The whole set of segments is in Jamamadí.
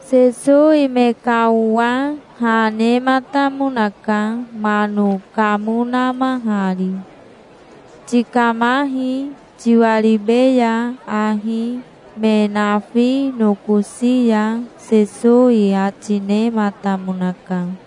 Sesowi me ka owa ha nematamonaka, mano kamo namahari. "Tikamahi, tiwaribeya ahi me nafi nokosi ya", Sesowi ati nematamonaka.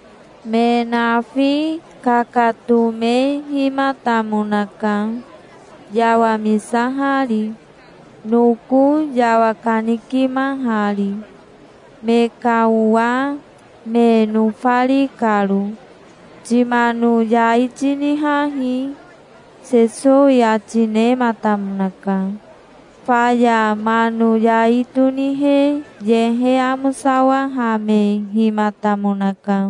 Me nafi kakatomehimatamonaka, yawamisahari, noko yawakanikimahari, me ka owa me nofari karo. "Timano yai tinihahi", Sesowi ati nematamonaka. Faya mano yai tonihe yehe amosawahamehimatamonaka.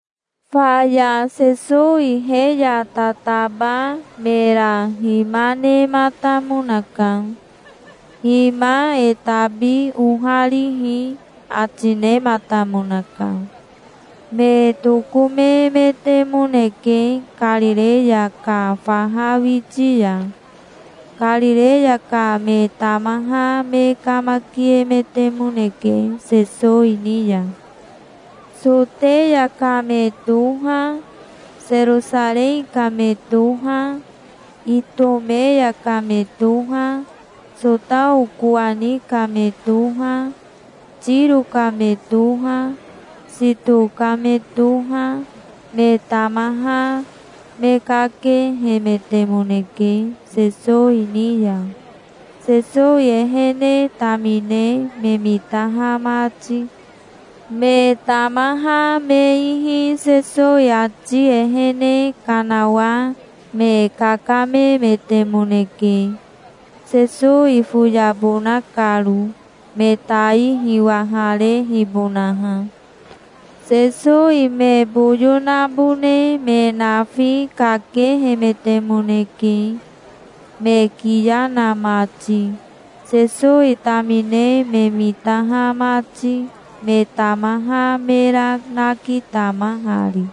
Faya Sesowi he ya tataba mera hima nematamonaka. "Hima e tabi oharihi", ati nematamonaka. Me tokomemetemoneke Karireya ka faha witi ya. Karireya ka me tamaha me kamakiemetemoneke Sesowi ni ya. Soteya ka me toha, Serosarei ka me toha, Itomeya ka me toha, Sotao kowani ka me toha, Tiro ka me toha, Sito ka me toha, me tamaha me kakehemetemoneke, Sesowi ni ya, Sesowi ehene tamine me mitaha mati. Me tamaha me ihi Sesowi ati ehene kanawa me kakamemetemoneke, Sesowi foyabona karo, me tai hiwaharehibonaha. Sesowi me boyo nabone me nafi kakehemetemoneke, me kiya na mati, Sesowi tamine me mitaha mati, me tamaha mera nakitamahari.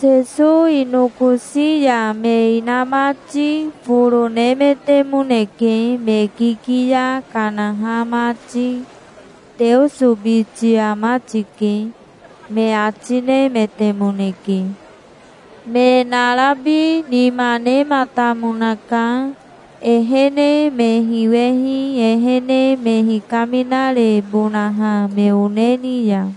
Sesowi nokosi ya me inamati foro nemetemoneke, me kikiya kanaha mati. "Teoso biti ama tike", me ati nemetemoneke. Me narabi nima nematamonaka, ehene me hiwehi ehene me hikaminarebonaha me one ni ya.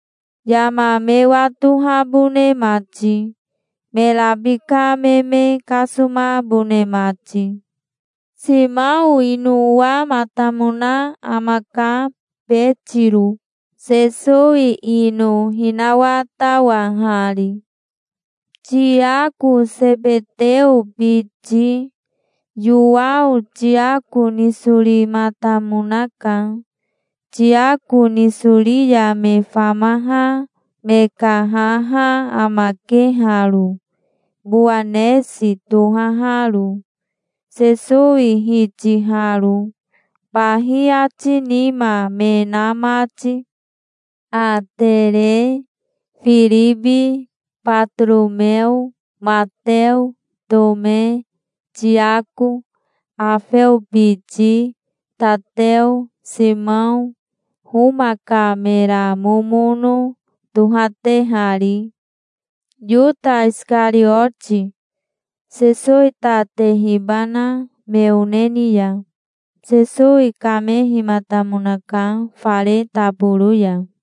yama me watohabone mati, me rabika me me kasomabone mati. Simao ino owamatamona amaka, Betiro, Sesowi ino hinawatawahari. Tiako Sebeteo biti. Yowao Tiako nisorimatamonaka. Tiako nisori ya me famaha me ka haha amake haro, Bowanesi tohaharo, Sesowi hitiharo, bahi ati nima me na mati. Atere, Firibi, Batoromeo, Mateo, Tome, Tiako Aofeo biti, Tateo, Simao, Homa ka mera momono tohatehari. Yota Isikarioti, Sesowi ta tehibana me one ni ya. Sesowi kamehimatamonaka fare taboro ya.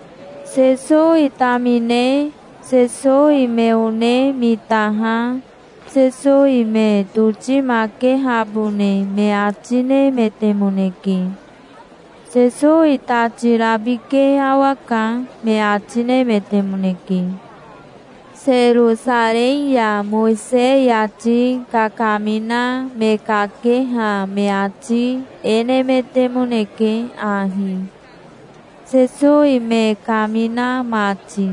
Sesowi tamine Sesowi me one mitaha Sesowi me totimakehabone me ati nemetemoneke. "Sesowi tati rabike awaka", me ati nemetemoneke. Serosarei ya Mowisei ati kakamina me kakeha me ati e nemetemoneke ahi, Sesowi me kamina mati: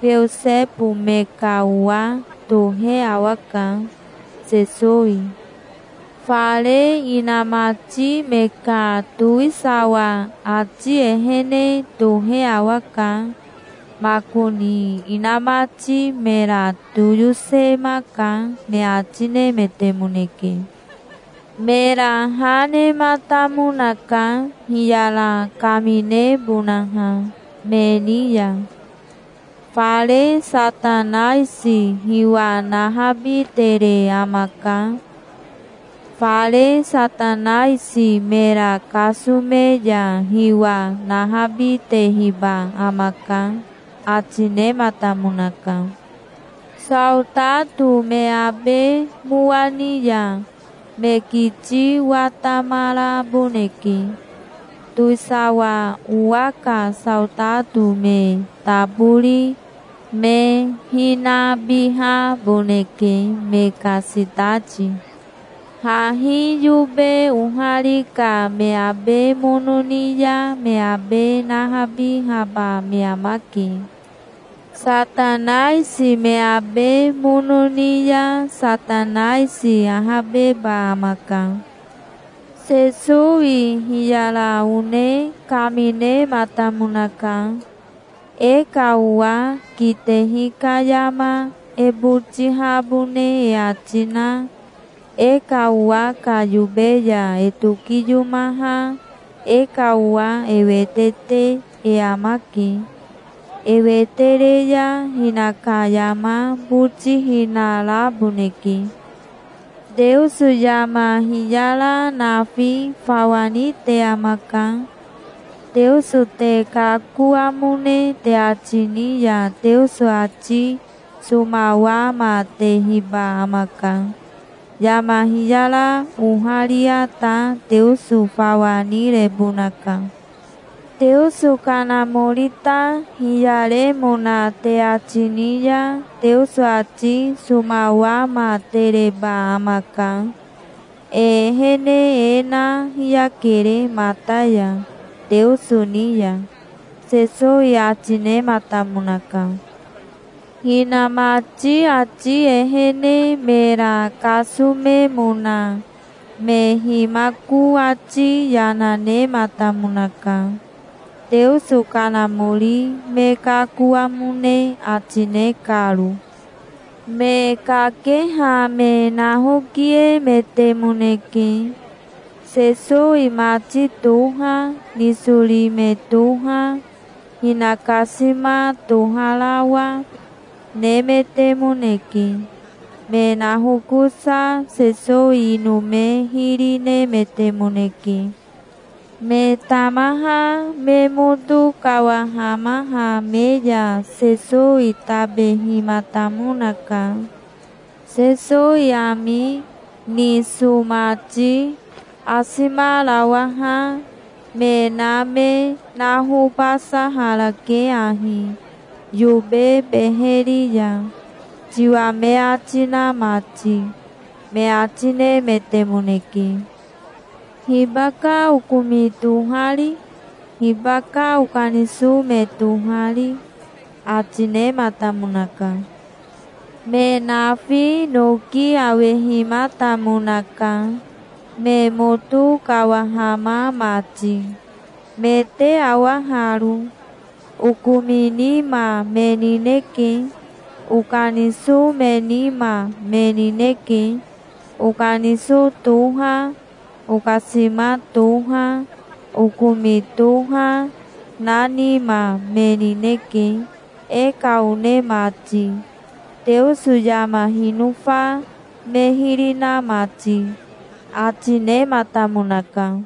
"Beosebo me ka owa tohe awaka, Sesowi. Fare inamati me ka towisawa ati ehene tohe awaka. Makoni inamati mera toyosemaka", me ati nemetemoneke. Mera ha nematamonaka, hiyara kaminebonaha me ni ya. "Fare Satanaisi hiwa nahabitere amaka. Fare Satanaisi mera kasome ya hiwa nahabitehiba amaka", ati nematamonaka. "Saotato me abe mowa ni ya, me kiti watamaraboneke. Towisawa owa ka saotato me tabori me hinabihaboneke, me ka sitati. Hahi yobe ohari ka me abe mono ni ya me abe nahabihaba me amake. Satanaisi me abe mono ni ya Satanaisi ahabeba amaka". Sesowi hiyara one kaminematamonaka. "E ka owa kitehi ka yama e botihabone e ati na e ka owa ka yobe ya e tokiyomaha e ka owa e wete te e amake. E wete re ya hinaka yama botihina raboneke". "Teoso yama hiyara nafi fawa nite amaka. Teoso te kakoamone te ati ni ya Teoso ati somawamatehiba amaka. Yama hiyara oharia ta Teoso fawa nirebonaka. Teoso Kanamori ta hiyaremona te ati ni ya Teoso ati somawamatereba amaka. E ehene e na hiyakere mata ya, Teoso ni ya", Sesowi ati nematamonaka. Hinamati ati ehene mera kasomemona me himako ati yana nematamonaka, Teoso Kanamori me kakoamone ati ne karo. Me kakeha me nahokiemetemoneke. Sesowi mati toha, nisori me toha, hinakasima toharawa, nemetemoneke. Me nahokosa Sesowi ino me hiri nemetemoneke. Me tamaha me moto kawahamaha me ya Sesowi tabehimatamonaka. "Sesowi ami, niso mati, asimarawaha, me na me nahobasaharake ahi yobe beheri ya, tiwa me ati na mati", me ati nemetemoneke. "Hibaka okomi tohari? Hibaka okaniso me tohari?" ati nematamonaka. Me nafi noki awehimatamonaka, me moto kawahama mati. "Me te awa haro. Okomi nima me nineke. Okaniso me nima, me nineke. Okaniso toha, okasima toha, okomi toha, na nima me nineke, e ka one mati, Teoso yama hinofa me hiri na mati", ati nematamonaka.